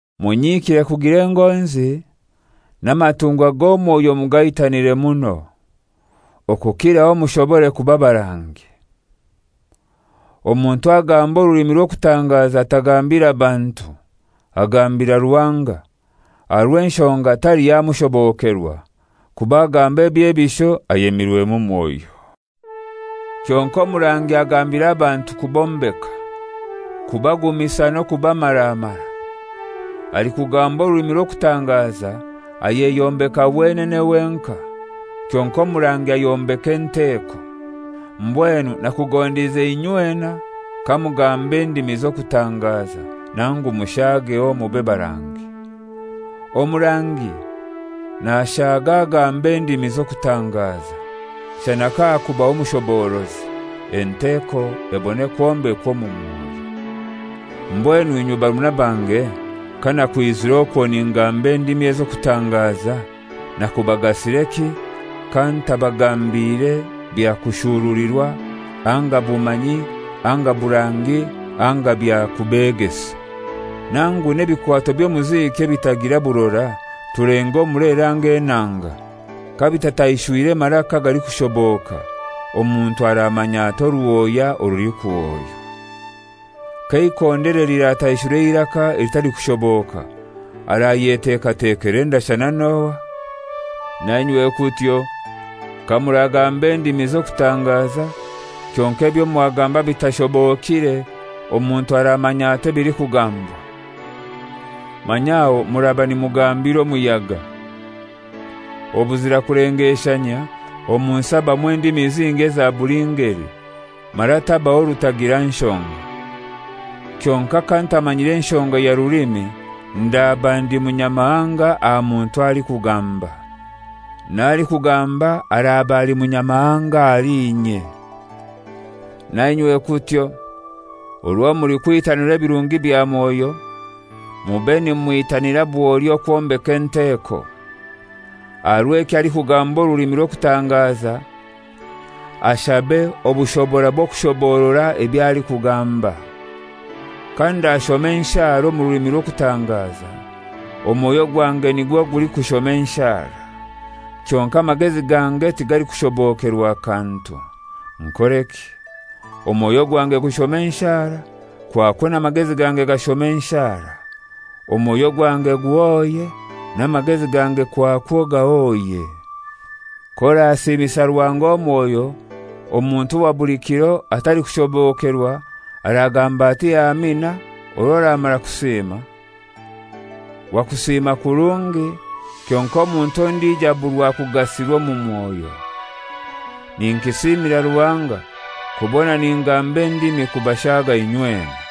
Munyikire kugira engonzi, n'amatungwa g'omwoyo mugaitanire muno, okukiraho mushobore kuba barangi. Omuntu agamba orulimi rw'okutangaza tagambira bantu, agambira Ruhanga; aha rw'enshonga taliho amushobokerwa, kuba agamba ebyebisho ayemirwemu Mwoyo. Kyonkai omurangi agambira abantu kubombeka, kubagumisa n'okubamaramara. Alikugamba orulimi rw'okutangaza ayeyombeka wenene wenkai, kyonkai omurangi ayombeka enteko. Mbwenu nakugondize inywena kamugamba endimi z'okutangaza, nangu mushaageho mube barangi. Omurangi nashaga agamba endimi z'okutangaza, shana kahakubaho omushoborozi, enteko ebone kwombekwa omu mwoyo. Mbwenu inywe barumuna bange, kanakwizire okwo ningamba endimi ez'okutangaza, nakubagasireki, kantabagambire bya kushurulirwa anga bumanyi anga burangi anga bya kubegesa? Nangu n'ebikwato by'omuziki ebitagira burora, tulenge omulere anga enanga: Kabitataishwire maraka agalikushoboka, omuntu aramanya atai oruhoya orulikuhoywa? K'eikondere lirataishura eiraka elitalikushoboka, arayetekatekera endashana n'ohai? Na inywe kutyo: Kamuragamba endimi z'okutangaza, kyonkai ebyo mwagamba bitashobokire, omuntu aramanya atai ebilikugambwa? Manya aho muraba nimugambira omuyaga. Obuzira kulengeshanyia omu nsi habamu endimi zingi eza buli ngeli, mara tabaho rutagira nshonga. Kyonkai kantamanyire nshonga ya rulimi ndaba ndi munyamahanga aha muntu alikugamba, n'alikugamba araba ali munyamahanga ahali inye. Na inywe kutyo: Orwo mulikwitanira ebirungi bya Mwoyo, mube nimwitanira bwoli okwombeka enteko. Aha rw'ekyo alikugamba orulimi rw'okutangaza ashabe obushobora bw'okushoborora eby'alikugamba. Kandashoma enshara omu rulimi rw'okutangaza, omwoyo gwange nigwo gulikushoma enshara, kyonkai amagezi gange tigalikushobokerwa kantu. Nkoreki? Omwoyo gwange gushome enshara, kwakwo n'amagezi gange gashome enshara. Omwoyo gwange guhoye, n'amagezi gange kwakwo gahoye. K'orasiimisa Ruhanga omwoyo, omuntu owa buli kiro atalikushobokerwa aragamba ati «Amina» orwo oramara kusiima? Wakusiima kurungi, kyonkai omuntu ondijo aburwa kugasirwa omu mwoyo. Ninkisiimira Ruhanga kubona ningamba endimi kubashaaga inywena.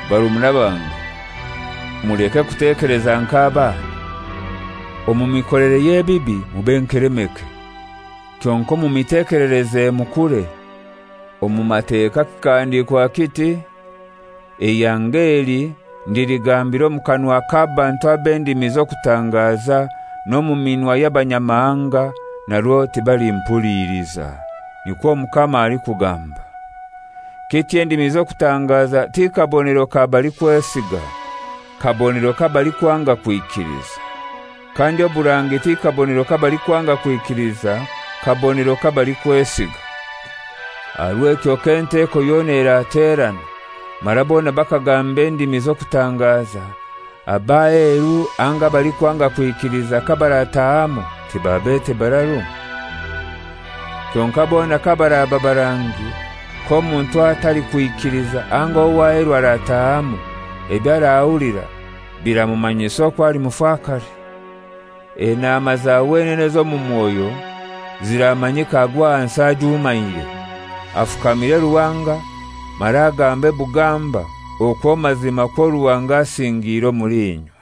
Barumuna bange, muleke kutekeleza nk'abaana: Omu mikolere y'ebibi mube nkelemeke, kyonkai omu mitekelereze mukure. Omu Mateka kikahandiikwa kiti, «Eihanga eli ndiligambira omu kanwa k'abantu ab'endimi z'okutangaza n'omu minwa y'abanyamahanga narwo tibalimpuliiliza, nikwo Omukama alikugamba.» Kityo endimi z'okutangaza tikabonero ka balikwesiga; kabonero k'abalikwanga kwikiliza. Kandi oburangi ti kabonero k'abalikwanga kwikiliza; kabonero k'abalikwesiga. Aha rw'ekyo k'enteko yona eraterana mara bona bakagamba endimi z'okutangaza, ab'aheru anga abalikwanga kwikiliza kabaratahamu tibabete bararu? Kyonkai bona kabaraba barangi, k'omuntu atalikwikiliza anga ow'aheru arataahamu, eby'arahulira biramumanyisa okwo ali mufakare. Enaama za wenene ez'omu mwoyo ziramanyikaagwe ahansi ajumaire, afukamire Ruhanga mara agambe bugamba okwo mazimakwo Ruhanga asingiire omuli inywe.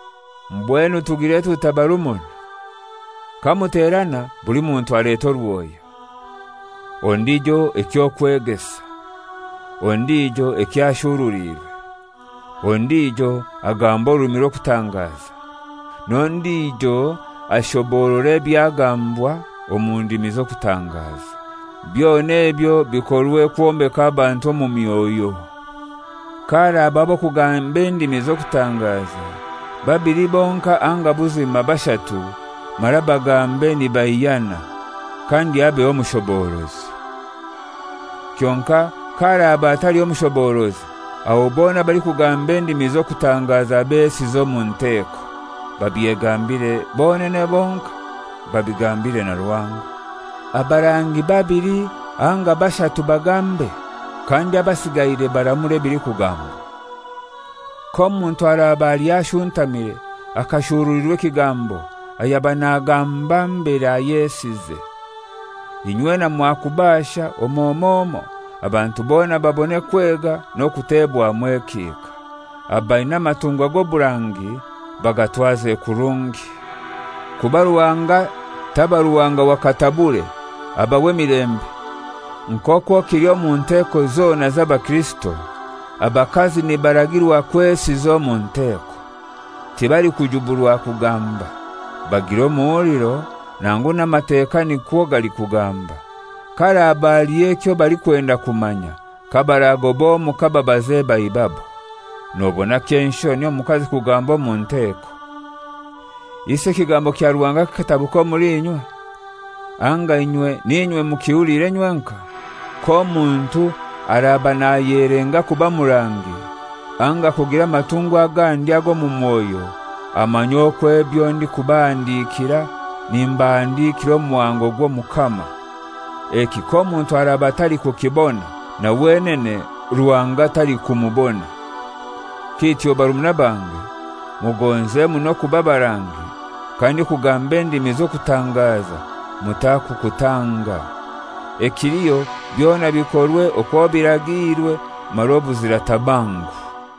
Mbwenu tugire tutai barumuna? Kamuterana buli muntu aleta oruhoya, ondijo eky'okwegesa, ondijo ekyo ashuruliirwe, ondijo agamba orulimi rw'okutangaza, n'ondijo ashoborora ebyagambwa omu ndimi z'okutangaza. Byona ebyo bikorwe kwombeka abantu omu myoyo. Kaharabaho ab'okugamba endimi z'okutangaza, babili bonkai anga buzima bashatu, mara bagambe nibaihyana. Kandi habeho omushoborozi. Kyonkai kaharaba hataliho mushoborozi, aho bona abalikugamba endimi z'okutangaza besize omu nteko, babyegambire bonene bonkai, babigambire na Ruhanga. Abarangi babili anga bashatu bagambe, kandi abasigaire baramure ebilikugambwa. K'omuntu araba aliho ashuntamire akashurulirwa ekigambo, ayaba nagamba mbere ayesize. Inywena mwakubasha omoi omoi omoi, abantu bona babone kwega n'okutebwamu ekihika. Abaina amatungwa g'oburangi bagatwaze kurungi. Kuba Ruhanga taba Ruhanga wa katabure, aba w'emilembe. Nk'okwo kili omu nteko zona z'abakirisito, abakazi nibaragirwa kwesiza omu nteko. Tibalikujuburwa kugamba. Bagire omuhuliro, nangu n'Amateka nikwo galikugamba. Kaharaba haliho ekyo balikwenda kumanya, kabaragoba omuka babaze baibabo. Nobona ky'enshoni omukazi kugamba omu nteko. Isi ekigambo kya Ruhanga kikatabuka omuli inywe? Anga inywe n'inywe mukihulire nywenkai? K'omuntu araba nayelenga kuba murangi, anga kugira amatungwa agandi ag'omu mwoyo, amanye okwo ebyo ndikubahandikira nimbahandikira omuhango gw'Omukama. Eki k'omuntu araba atalikukibona, na wenene Ruhanga talikumubona. Kityo barumuna bange, mugonze muno okuba barangi, kandi okugamba endimi z'okutangaza mutakukutanga. Ekiliho byona bikorwe okwo biragiirwe, mara obuzira tabangu.